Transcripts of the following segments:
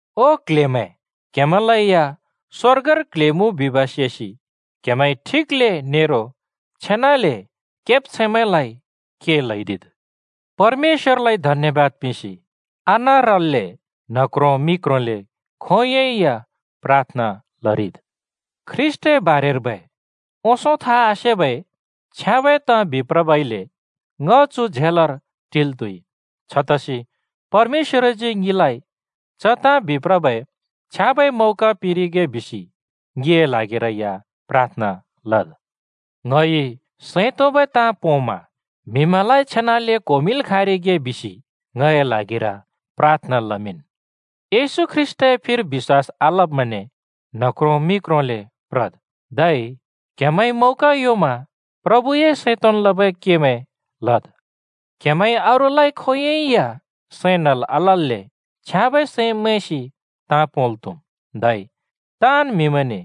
ओ क्ल्हेमैं, क्‍हेमैंलै या स्‍वर्गर क्ल्हे मुँ बिब् सेसि क्‍हेमैंइ ठिकले नेरो छेनाले केब्छैंमैं के ल्‍हैदिद्। परमेश्‍वरलाइ धन्‍यवाद पिंसि आनारल्‍ले न्ह क्रो मि क्रोंले खोंयोंइ या प्राथना लरिद्। ख्रीष्‍टए बारेर्बै ओंसों था आसेबै छ्याँबै ताँ बिप्रबइले ङ चुर झेलर टिल् त्‍हुइ। छतसि परमेश्‍वरजी ङिलाइ च ताँ बिप्रबै छ्याँबै मौका पिंरिगे बिसि ङिए ल्हागिरै या प्राथना लद्। ङइ सैं तोंबै ताँ पोंमा म्हिमैंलाइ छेनाले क्होमिंल् खाँरिगे बिसि ङए ल्हागिर प्राथना लमिंन्। येशू ख्रीष्‍टए फिर बिश्‍वास आलब्मैंने न्ह क्रों मि क्रोंले प्रद्। धै क्‍हेमैंइ मौका योंमा प्रभुए सैं तोंन् लबै केमैं लद्। क्‍हेमैंइ अरूलाइ खोंयोंइ सैं नल् आलल्‍ले छ्याँबै सैं मैंसि ताँ पोंल् त्‍हुम्। धै ताँन् म्‍हिमैंने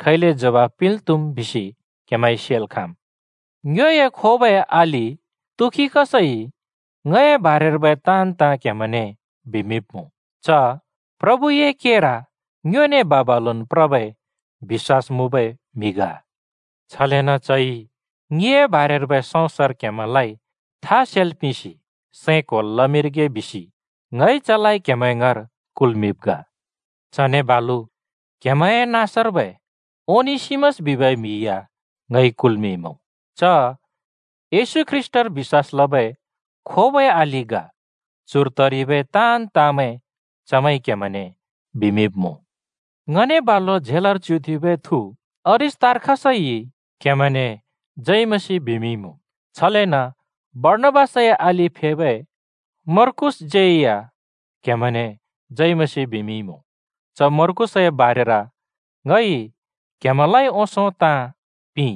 खैले जवाफ पिंल् त्‍हुम् बिसि क्‍हेमैंइ सेल् खाँम्। ङ्योए खोबै अलि तुखिकसइ ङए बारेर्बै ताँन् ताँ क्‍हेमैंने बिमिंब्‍मुँ। च प्रभुए केर ङ्योने बा-बालुन् प्रबै बिश्‍वास मुँबै म्हि ग। छलेन चइ ङिए बारेर्बै सौंसर क्‍हेमैंलाइ था सेल् पिंसि सैं क्‍होल् लमिंरिगे बिसि ङइ चलाइ क्‍हेमैं ङाँर कुल्‍मिंब् ग। चने बालु क्‍हेमैंए नाँसर्बै ओनेसिमस बिबै म्‍हि या ङइ कुल्‍मिंइमुँ। च येशू ख्रीष्‍टर बिश्‍वास लबै खोबै अलि ग। चुर तरिबै ताँन् ताँमैं चमैंइ क्‍हेमैंने बिमिंब्‍मुँ। ङने बालु झेलर च्युथेंबै थु अरिस्‍तार्खसइ क्‍हेमैंने जय मसीह बिमिंइमुँ। छलेन बर्णाबासए अलि फेबै मर्कूसज्‍यै या क्‍हेमैंने जय मसीह बिमिंइमुँ। (च मर्कूसए बारेर ङइ क्‍हेमैंलाइ ओंसों ताँ पिंइ: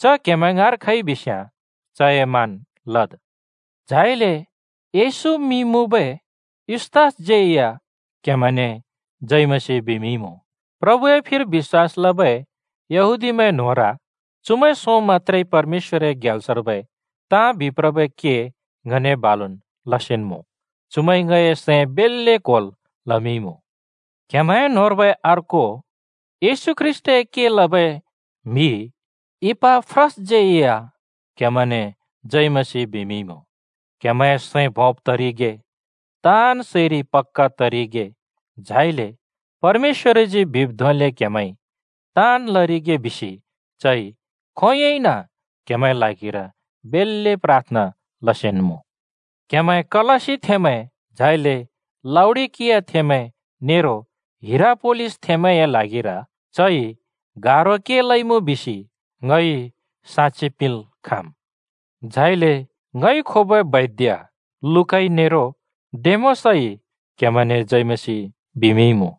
च क्हेमैं ङाँर खइबिस्‍याँ चए मान लद्।) झाइले युस्‍तस बिबै येशूज्‍यै या क्‍हेमैंने जय मसीह बिमिंइमुँ। प्रभुए फिर बिश्‍वास लबै यहूदीमैं न्‍होंर चुमैं सों मत्‍त्रेइ परमेश्‍वरए ग्याल्सर्बै ताँ बिप्रबै के ङने बालुन् लसेन्‍मुँ। चुमैंइ ङए सैं बेल्‍ले क्‍होल् लमिंइमुँ। क्‍हेमैं न्‍होंर्बै अर्को येशू ख्रीष्‍टए के लबै म्‍हि इपाफ्रासज्यै या क्‍हेमैंने जय मसीह बिमिंइमुँ। क्‍हेमैंए सैं भोंब् तरिगे, ताँन् सैरि पक्‍का तरिगे, झाइले परमेश्‍वरजी बिब् धोंले क्‍हेमैंइ ताँन् लरिगे बिसि चइ खोंयोंइन क्‍हेमैंए ल्हागिर बेल्‍ले प्राथना लसेन्‍मुँ। क्‍हेमैं कलस्‍सीथेंमैं, झाइले लाउडिकियाथेंमैं नेरो हिरापोलिसथेंमैंए ल्हागिर चइ गारो के लइमुँ बिसि ङ ह्रोंसन साक्षि पिंल् खाँम्। झाइले खोबै वैद्य लूकाइ नेरो डेमासइ क्‍हेमैंने जय मसीह बिमिंइमुँ।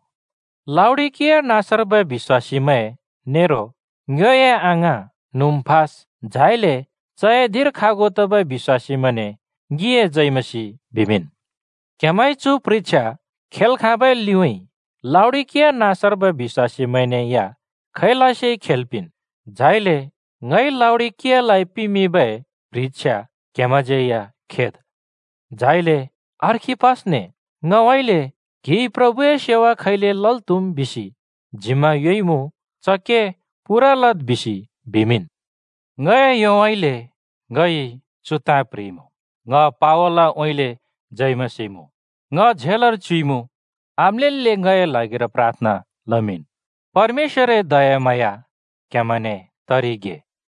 लाउडिकिया नाँसर्बै बिश्‍वासीमैं नेरो ङ्योए अङाँ नुम्‍फा, झाइले चए धिंर खागु तबै बिश्‍वासीमैंने ङिए जय मसीह बिमिंन्। क्‍हेमैंइ चु प्ह्रिछ्या खेल् खाँबै लिउँइँ लाउडिकिया नाँसर्बै बिश्‍वासीमैंने या खैलसे खेल् पिंन्। झाइले ङइ लाउडिकियालाइ पिमिंबै प्ह्रिछ्या क्‍हेमैंज्‍यै या खेद्। झाइले अर्खिप्पसने ङउँइँले “क्‍हिइ प्रभुए सेवा खैले लल् त्‍हुम् बिसि जिम्‍मा योंइमुँ, च के पूरा लद्,” बिसि बिमिंन्। ङए योउँइँले ङइ चु ताँ प्‍ह्रिइमुँ: ङ पावलउँइँले जय मसीह मुँ। ङ झेलर च्युइमुँ आम्‍लेल्‍ले ङए ल्हागिर प्राथना लमिंन्। परमेश्‍वरए दयाम्हाँया क्‍हेमैंने तरिगे।